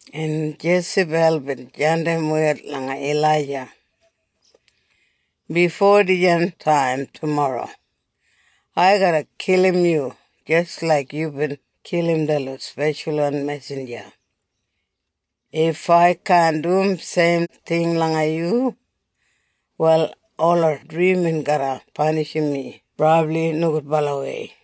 En Jesabel bin jandim wed langa Ilaija, “Bifo dijan taim tumorro, ai garra kilim yu jis laik yubin kilim detlot speshalwan mesinja. If ai kaan dum seim ting langa yu, wal ola drimin garra panishim mi brabli nogudbalawei.”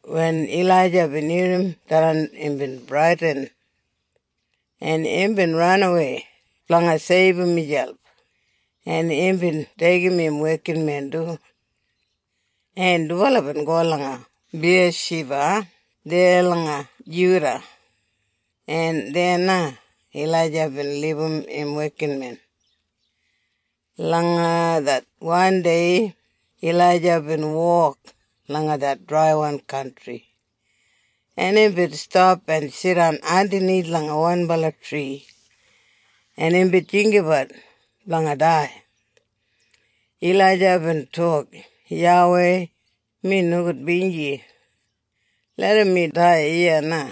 Wen Ilaija bin irrim tharran imbin bradin, en imbin ranawei blanga seibum miselp, en imbin deigim im wekinmen du, en dubala bin go langa Biyashiba deya langa Juda, en deya na Ilaija bin libum im wekinmen. Langa det wandei Ilaija bin wok langa det draiwan kantri. En imbin stap en jidan andanith langa wanbala tri en imbin jinggabat blanga dai. Ilaija bin tok, “YAWEI, mi nogudbinji. Larram mi dai iya na.”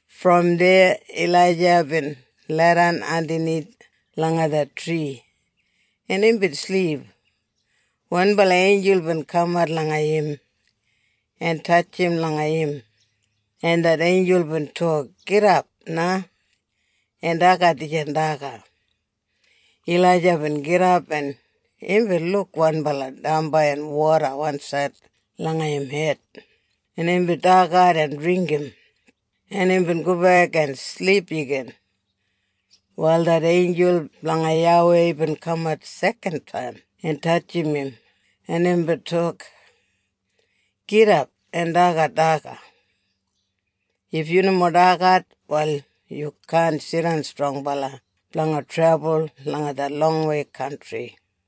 Brom deya Ilaija bin leidan andanith langa det tri en imbin silip. Wanbala einjul bin kamat langa im, en tatjim langa im, en det einjul bin tok, “Gidap na en dagat dijan daga.” Ilaija bin gidap en imbin luk wanbala damba en woda wansaid langa im hed en imbin dagat en dringgim en imbin gobek en silip igin. Wal det einjul blanga YAWEI bin kaman sekan taim en tatjim im en imbin tok, “Gidap en dagat daga. If yu nomo dagat, wal yu kaan jidan strongbala blanga trebul langa det longwei kantri.”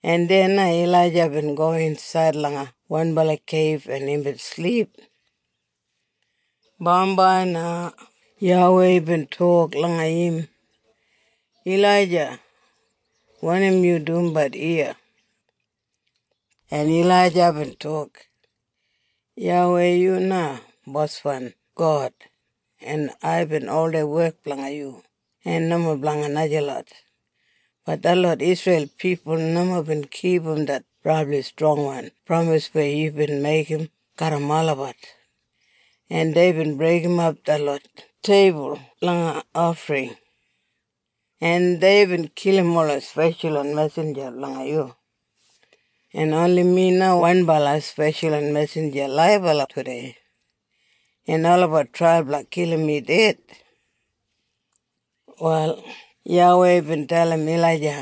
En deya na Ilaija bin go insaid langa wanbala keib en imbin silip. Bambai na YAWEI bin tok langa im, “Ilaija wanim yu dumbat iya?” En Ilaija bin tok, “YAWEI yu na Boswan God, en aibin oldei wek blanga yu en nomo blanga najalot. Bat detlot Isreil pipul nomo bin kipum det brabli strongwan pramis weya yubin meigim garram olabat, en deibin breigimap detlot teibul blanga ofring, en deibin kilim ola speshalwan mesinja blanga yu, en oni mi na wanbala speshalwan mesinja laibala tudei, en olabat trai blanga kilim mi ded!” Wal YAWEI bin dalim Ilaija,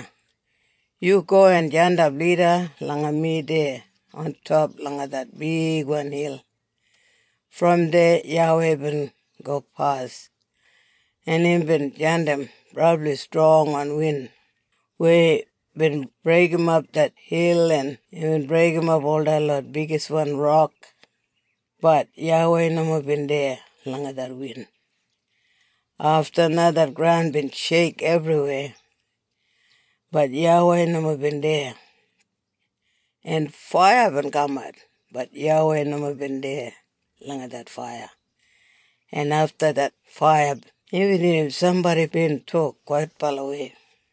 “Yu go en jandap lida langa mi deya ontop langa det bigwan hil.” Brom deya YAWEI bin gopas en imbin jandim brabli strongwan win weya bin breigimap det hil en imbin breigimap ol detlot bigiswan rok, bat YAWEI nomo bin deya langa det win. Afta na det graun bin sheik ebriweya, bat YAWEI nomo bin deya. En faiya bin kamat, bat YAWEI nomo bin deya langa det faiya. En afta det faiya imbin irrim sambodi bin tok kwaitbalawei.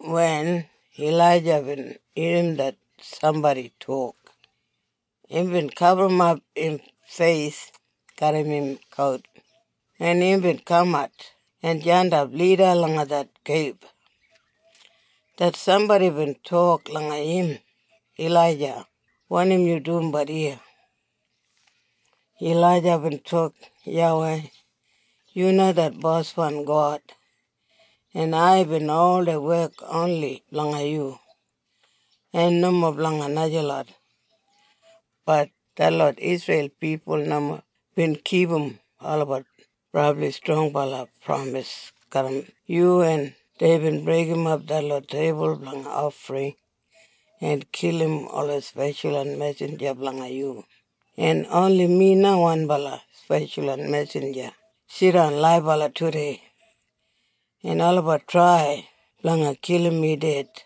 Wen Ilaija bin irrim det sambodi tok, imbin gaburrumap im feis garram im kout en imbin kamat en jandap lida langa det keib. Det sambodi bin tok langa im, “Ilaija wanim yu dumbat iya?” Ilaija bin tok, “YAWEI, yu na det Boswan God, en aibin oldei wek oni blanga yu, en nomo blanga najalot, bat detlot Isreil pipul nomo bin kipum olabat brabli strongbala pramis garram yu en deibin breigimap detlot teibul blanga ofring en kilim ola speshalwan mesinja blanga yu en oni mi na wanbala speshalwan mesinja jidan laibala tudei, en olabat trai blanga kilim mi ded!”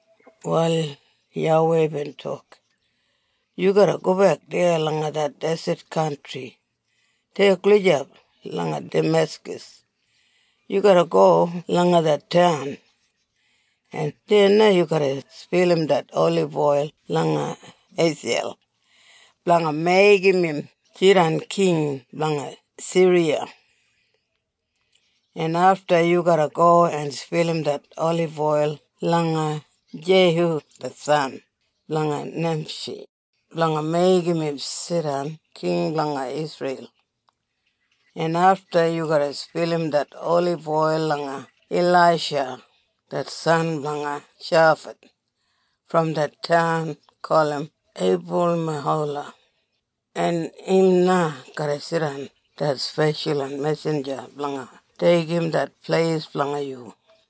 Wal YAWEI bin tok, “Yu garra gobek deya langa det deset kantri deya gulijap langa Dameskas. Yu garra go langa det taun, en deya na yu garra spilim det oliboil langa Heiseiyel blanga meigim im jidan king blanga Siriya, en afta yu garra go en spilim det oliboil langa Jeihu det san blanga Nimshi blanga meigim im jidan king blanga Isreil. En afta yu garra spilim det oliboil langa Ilaisha det san blanga Shafat brom det taun gulum Eibulmehola en im na garra jidan det speshalwan mesinja blanga deigim det pleis blanga yu.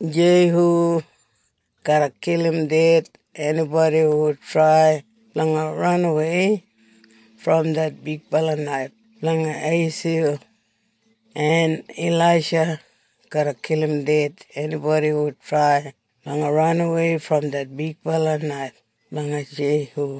Jeihu garra kilim ded enibodi hu trai blanga ranawei brom det bigbala naif blanga Heiseiyel, en Ilaisha garra kilim ded enibodi hu trai blanga ranawei brom det bigbala naif blanga Jeihu.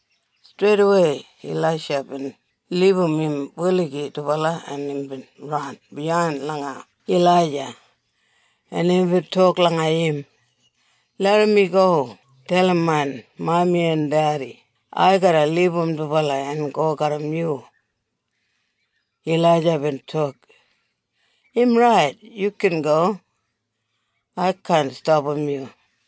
Streidawei Ilaisha bin libum im buligi dubala en imbin ran biyain langa Ilaija en imbin tok langa im, “Larram mi go dalim main mami en dedi ai garra libum dubala en go garram yu.” Ilaija bin tok, “Im rait. Yu gin go. Ai kaan stapam yu.”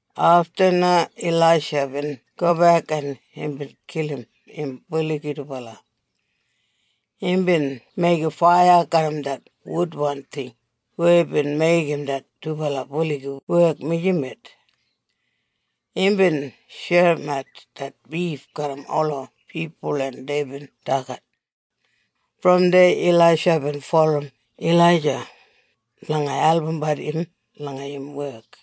Afta na Ilaisha bin gobek en imbin kilim im buligi dubala. Imbin meigim faiya garram det wudwan ting weya bin meigim det dubala buligi wek mijamet. Imbin sherimat det bif garram ola pipul en deibin dagat. Brom deya Ilaisha bin bulurrum Ilaija blanga albumbat im langa im wek.